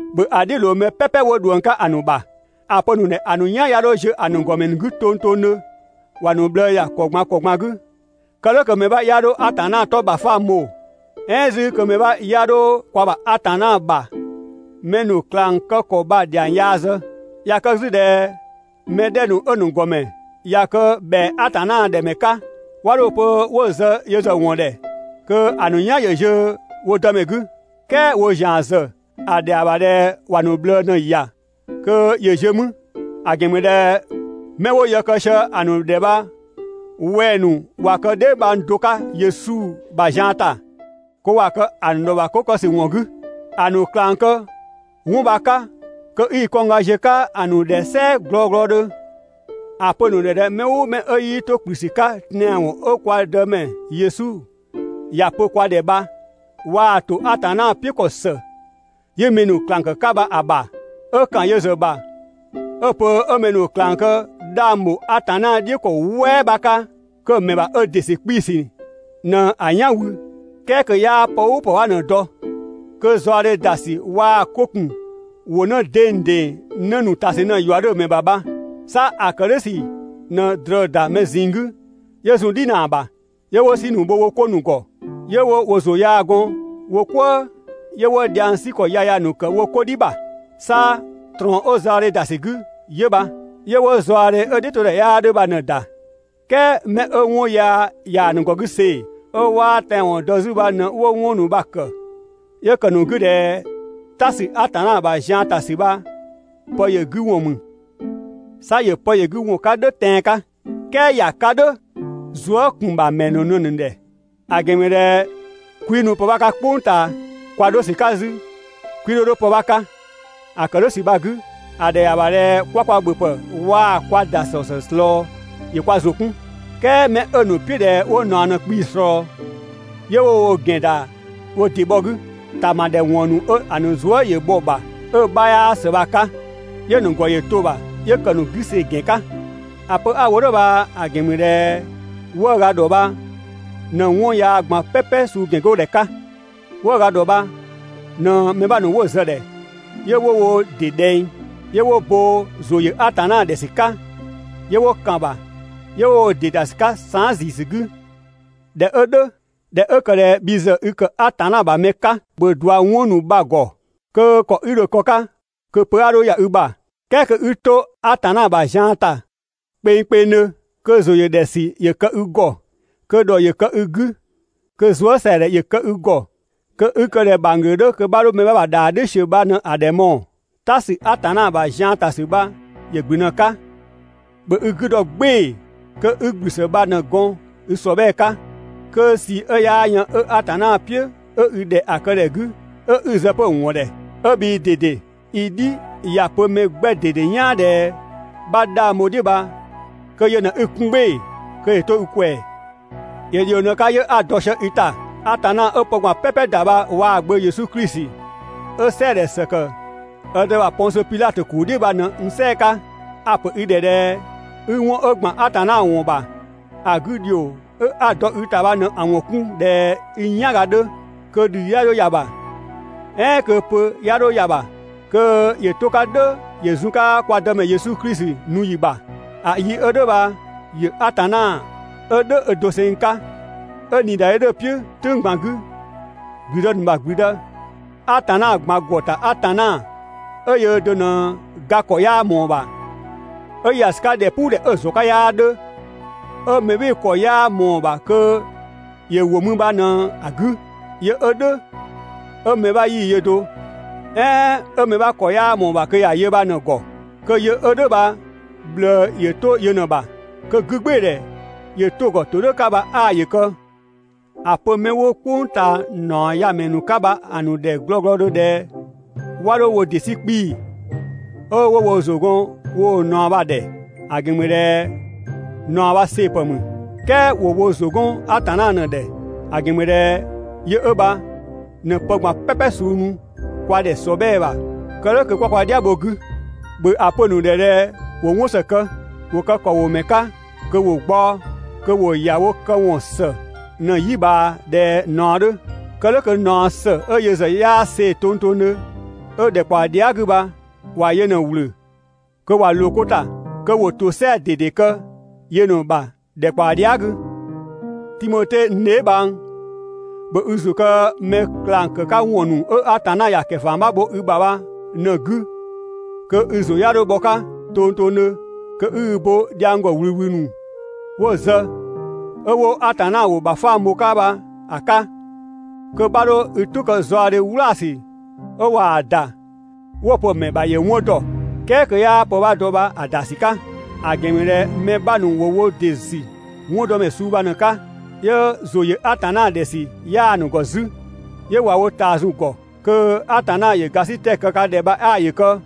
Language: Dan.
‑Bhö ‑a "dhiʋ̈ ꞊loo mɛ "pɛpɛ 'wo ꞊dhuëng 'ka ‑a ‑nu ‑bha. ‑A pö‑ ‑nu ‑dhɛ ‑a ‑nu "yan 'ya 'dho ziö‑ ‑nu ‑gɔmɛ ‑nu 'gü tongtongdhö, ‑wa ‑nu ꞊bhlëë ‑ya ‑kɔ ꞊gban ‑kɔ ꞊gban 'gü, kë "dhʋ̈ kö mɛ 'bha 'ya 'dho Atanna 'tɔ ‑bhafang bho, "ɛɛn 'zü kö mɛ 'bha 'ya 'dho kwa ‑bha Atanna ‑bha mɛ ‑nu ꞊klang kë ‑kɔ bha‑ ‑dhiang yaa zë. ꞊Ya kë 'zü ꞊dhɛ mɛ 'dhɛ ‑nu 'ö‑ ‑nu ‑gɔmɛ ꞊ya kë ‑bhɛa Atanna ‑dhɛ ‑mɛ 'ka, 'wa 'dho‑ pö 'wo zë yö ‑zë ‑wɔn ‑dhɛ kö ‑a ‑nu "yan‑ ziö wo Dëmɛ 'gü. "Kɛɛ woo ‑zian ‑zë ‑a ‑dhɛa ‑bha ꞊dhɛ ‑wa ‑nu ꞊bhlëë ꞊në‑ ‑ya kö ‑yö ziö 'mü, ‑a ‑gɛn ‑mü ꞊dhɛ 'mɛ 'wo yë kë sië‑ ‑nu ‑dhɛ bha wɛng‑ ‑nu ꞊wa kë dheebhang do 'ka Yesu ‑bha zian ‑ta, kö ‑wa kë‑ ‑nu ‑dhɔ ‑bha 'ko kë ‑sü ‑wɔn 'gü. ‑A ‑nu ꞊klang kë 'wɔn bha‑ 'ka kö 'i i kɔngga ziö‑ 'ka‑ ‑nu ‑dhɛ "sɛɛ glɔglɔdhö. ‑A pö‑ ‑nu ‑dhɛ ꞊dhɛ mɛ "ʋʋ mɛ 'ö 'yii 'to ‑kplü ‑sü 'ka tɛanwɔn 'ö kwa Dëmɛ Yesu ‑ya pö kwa ‑dhɛ bha, waa ‑to Atanna "piʋ̈ ‑kɔ ‑së 'yi mɛ ‑nu ꞊klang ‑kë 'ka bha‑ ‑bha, 'ö ‑kan yö ‑zë ‑bha 'ö‑ pö 'ö mɛ ‑nu ꞊klang kë 'dhang ‑bho Atanna "dhiʋ̈ ‑kɔ "wɛɛ 'bha 'ka, kö‑ ‑mɛ ‑bha ö ‑dɩ ‑sü 'kpii‑ ‑sü ꞊në‑ "yan wü, "kɛɛ kö 'yaa pë "ʋʋ pë 'bha ꞊në‑ dɔ, kö zaɔdhe ‑da ‑sü waa‑ 'ko ‑kun ‑wʋ 'në dengdeng 'në ‑nu ‑ta ‑sü ꞊në‑ ‑yua 'dhö‑ ‑mɛ ‑bha bha, 'sa ‑a kë "dhʋ̈ ‑sü ꞊në ꞊drɔ ‑da mɛ ꞊zinng 'gü 'yö zun "dhinaa ‑bha, 'yö 'wo "si ‑nu bho wo 'ko ‑nu ‑gɔ, 'yö 'wo ‑zʋ yaa gɔn wo "kwëë, 'yö 'wo dhiang 'sü ‑kɔ yaya ‑nu ‑kë wo 'ko "dhi ‑bha. 'Sa ꞊trɔɔn 'ö zaɔdhe ‑da ‑sü 'gü 'yö bha. 'Yö 'wo zaɔdhe 'ö‑ "dhiʋ̈todhɛ 'yaa 'dhö bha ꞊në‑ ‑da. "Kɛɛ 'mɛ 'ö 'wɔn yaa ꞊yaa‑ ‑nu ‑gɔ 'gü see‑, 'ö 'waa tɛanwɔn dɔ 'zü bha ꞊në 'wo 'wɔn ‑nu bha‑ ‑kë, 'yö ‑kë ‑a ‑nu 'gü ꞊dhɛ "ta ‑sü Atanna ‑bha zian ‑ta ‑sü bha pë ‑yö 'gü ‑wɔn ‑mü. 'Sa ‑yö pë ‑yö 'gü ‑wɔn 'ka "dhʋ̈ tɛan‑ 'ka, "kɛɛ ‑ya 'ka "dhʋ̈ zuë" ‑kun ‑bha ‑mɛ ‑nu ꞊në ‑nu ‑dhɛ. ‑A ‑gɛn ‑mü ꞊dhɛ 'kwii nu pë 'bha 'ka "kpʋng ꞊taa, kwa 'dho ‑sü 'ka 'zü 'kwii 'dho 'dho pë 'bha 'ka. ‑A ‑kë "dhʋ̈ ‑sü bha‑ 'gü, ‑a ‑dhɛa ‑bha ꞊dhɛ 'kwa kwa ‑bhöpë waa‑ kwa ‑dasɔ ‑zë ꞊slɔɔ, ‑yö kwa ‑zʋ 'kun. "Kɛɛ 'mɛ 'ö‑ ‑nu "piʋ̈ ꞊dhɛ 'wo ꞊naɔ ꞊në‑ 'kpii‑ ꞊slɔɔ, 'yö 'wo wo ‑gɛn ‑da wo ‑dɩ bhɔ 'gü, ‑tama ‑dhɛ ‑wɔn ‑nu 'ö‑ ‑nu zuë" ‑yö bhɔ‑ ‑bha 'ö‑ 'bhaa ‑së bha‑ 'ka, 'yö‑ ‑nu ‑gɔ ‑yö to‑ ‑bha, 'yö ‑kë ‑nu 'gü see‑ ‑gɛn 'ka. ‑A pö 'a‑ wo "dhʋ̈ bha‑ ‑gɛn ‑mü ꞊dhɛ 'wëëga ‑dhɔ bha ꞊në 'wɔn yaa ꞊gban "pɛpɛ suu ‑gɛn 'go ‑dhɛ 'ka. 'Wëëga ‑dhɔ bha ꞊në mɛ 'bha ‑nu 'wo zë‑ ‑dhɛ 'yö 'wo wo ‑dɩ ‑dhɛng, 'yö 'wo bo ‑zʋ ‑yö Atanna ‑dhɛ ‑sü 'ka, 'yö 'wo ‑kan ‑bha, 'yö 'wo wo ‑dɩ ‑da ‑sü 'ka saan" ‑ziisü 'gü.» ꞊Dhɛ 'ö "dhʋ̈, ꞊dhɛ 'ö ‑kë ꞊dhɛ bhi ‑zë i ‑kë Atanna ‑bha mɛ 'ka, ‑bhö ꞊dua 'wɔn ‑nu bha‑ ‑gɔ, kö ‑kɔ 'i dho‑ kë‑ 'ka kö pö 'a 'dho ‑ya i ‑bha, "kɛɛ kö 'i 'to Atanna ‑bha zian ‑ta kpengkpengdhö, kö ‑zʋ ‑yö ‑dhɛ ‑sü ‑yö kë i ‑gɔ, kö ‑dhɔ ‑yö kë i 'gü, kö zuësɛadhɛ ‑yö kë i ‑gɔ, kö 'i kë ꞊dhɛ ‑bhangglö 'dhö kö 'bha 'dho mɛ 'bha ‑bha ‑dhaa "dhiʋ̈ ‑siö bha ꞊në ‑bhö ‑a ‑dhɛ mɔɔ‑. "Ta ‑sü Atanna ‑bha zian ‑ta ‑sü bha ‑yö ‑gblü ꞊në‑ 'ka, ‑bhö i 'gü dɔ "gbɩɩ‑ kö 'i ‑gblü ‑së bha ꞊në‑ gɔn i ‑sɔbhɛɛ 'ka, kö ꞊sii 'ö 'yaa yën 'ö Atanna "piʋ̈ 'ö i ‑dhɛ ‑a kë ‑dhɛ 'gü, 'ö 'i zë 'pö‑ ‑wɔn ‑dhɛ 'ö bhii ꞊dede i "dhi ‑ya pö mɛ 'gbɛ ꞊dede "yaan ꞊dhɛ 'bha 'dhang bho‑ "dhiʋ̈ bha, kö yö ꞊në 'i‑ 'kun "gbɩɩ‑ kö ‑yö 'to i ꞊kwɛɛ. ‑Yö ‑dhio ꞊në‑ 'ka 'yö 'a‑ dɔ sië i ‑ta, Atanna 'ö pë ꞊gban "pɛpɛ ‑da bha waa‑ Gbö Yesu Klisi 'ö "sɛɛdhɛ ‑së ‑kë ö Dë ‑bha Pɔngsö Pidhatö ‑kuu "dhiʋ̈ bha ꞊në 'wo n "sɛɛ‑ 'ka. A‑ ‑pö i ‑dhɛ ꞊dhɛ 'i 'wɔn 'ö ‑gban Atanna ‑wɔn ‑bha ‑a 'gü ‑dhio 'a‑ dɔ i ‑ta bha ꞊në‑ ‑wɔn 'kun ꞊dhɛ i "yanga 'dhö, kö ‑dhii 'ya 'dho ‑ya ‑bha, "ɛɛn kö pö a 'dho ‑ya ‑bha, kö ‑yö 'to‑ 'ka "dhʋ̈ ‑yö zun‑ 'ka kwa Dëmɛ Yesu Klisi nu ‑yi ‑bha. ‑A yi 'ö "dhʋ̈ bha ‑yö Atanna, 'ö "dhʋ̈ ö doseng 'ka, 'ö ꞊niidadhe 'dhö‑ "piʋ̈ "tʋ̈ng ꞊gban 'gü, ‑gblüdë ‑nu ‑bha ‑gblüdë, Atanna ꞊gban ‑gɔ ‑ta Atanna 'ö yöö do ꞊në ga ‑kɔ 'yaa ꞊mɔɔ‑ ‑bha, 'ö ‑ya ‑sü 'ka ‑dhɛpuudhɛ 'ö‑ ‑zɔn 'ka 'yaa 'dhö, 'ö mɛ "bhɩɩ‑ ‑kɔ 'yaa ꞊mɔɔ‑ ‑bha kö ‑yö ‑wo mü bha ꞊në‑ 'gü, yö 'ö "dhʋ̈ 'ö mɛ 'bha 'yii‑ yö do, "ɛɛn 'ö mɛ 'bha ‑kɔ 'yaa ꞊mɔɔ‑ ‑bha kö ‑ya yö bha ꞊në‑ ‑gɔ, kö yö 'ö "dhʋ̈ bha ꞊bhlëë ‑yö 'to yö ꞊në‑ ‑bha, kö 'gügbɩɩdhɛ ‑yö 'to‑ ‑gɔ ‑todhʋ̈ 'ka bha 'aa ‑yö kë! ‑A pö 'mɛ 'wo "kpʋng ꞊taa ‑naɔ ya‑ ‑mɛ ‑nu 'ka bha‑ ‑nu ‑dhɛ glɔglɔdhö ꞊dhɛ 'wa 'dho ‑wo ‑dɩ 'sü 'kpii‑ 'ö 'wo wo ‑zʋ gɔn woo ꞊naɔ bha‑ ‑dhɛ. ‑A ‑gɛn ‑mü ꞊dhɛ ꞊naɔ bha see‑ ‑pë ‑mü. "Kɛɛ ‑wo wo ‑zʋ 'gɔn Atanna ꞊në‑ ‑dhɛ, ‑a ‑gɛn ‑mü ꞊dhɛ yö 'ö bha ꞊në pë ꞊gban "pɛpɛ suu nu kwa ‑dhɛ ‑sɔbhɛɛ ‑bha kë "dhʋ̈ kö 'kwa kwa "dhiabho‑ bho‑ 'gü. ‑Bhö ‑a pö‑ ‑nu ‑dhɛ ꞊dhɛ ‑wo 'wɔn ‑së kë, ‑wo kë ‑kɔwomɛ 'ka kö ‑wo gbaɔ‑, kö ‑wo ‑ya wo këwɔn ‑së ꞊në‑ "yi ꞊bhaa ꞊dhɛ ꞊naɔ 'dhö. Kë "dhʋ̈ kö ꞊naɔ ‑së 'ö yö ‑zë 'yaa see‑ tongtongdhö 'ö ‑dhɛkpaɔ dhia" 'gü bha ‑wa yö ꞊në‑ ‑wlö kö ‑wa ꞊loo 'ko ‑ta, kö ‑wo ‑tosɛa ꞊dede kë yö ꞊në‑ ‑bha ‑dhɛkpaɔ dhia" 'gü. Timote n dheebhang, ‑bhö i ‑zʋ kë mɛ ꞊klang ‑kë 'ka ‑wɔn ‑nu 'ö Atanna ‑ya ‑kɛfama bho i ‑bha bha ꞊në‑ 'gü kö i ‑zʋ 'ya 'dho bhɔ‑ 'ka tongtongdhö, kö 'i i bo dhiang ‑gɔ ꞊wlüwlü ‑nu 'wo‑ zë, 'ö 'wo Atanna ‑wʋ ‑bhafang bho‑ 'ka bha‑ 'ka, kö 'bha 'dho i "tʋ kë zaɔdhe "wlaasü 'ö ꞊waa‑ ‑da 'wo‑ pö‑ ‑mɛ ‑bha ‑yö 'wɔn ‑dɔ, "kɛɛ kö 'yaa pë 'bha dɔ bha‑ ‑da ‑sü 'ka. ‑A ‑gɛn ‑mü ꞊dhɛ mɛ 'bha ‑nu ‑wo wo ‑dɩ ‑sü 'wɔndɔmɛ suu bha ꞊në‑ 'ka, 'yö ‑zʋ ‑yö Atanna ‑dhɛ ‑sü 'yaa‑ ‑nu ‑gɔ 'zü, 'yö ꞊wa wo ꞊taa zun‑ ‑gɔ. Kö Atanna ‑yö ‑gasitɛ kë ka ‑dhɛ bha 'aa ‑yö kë!»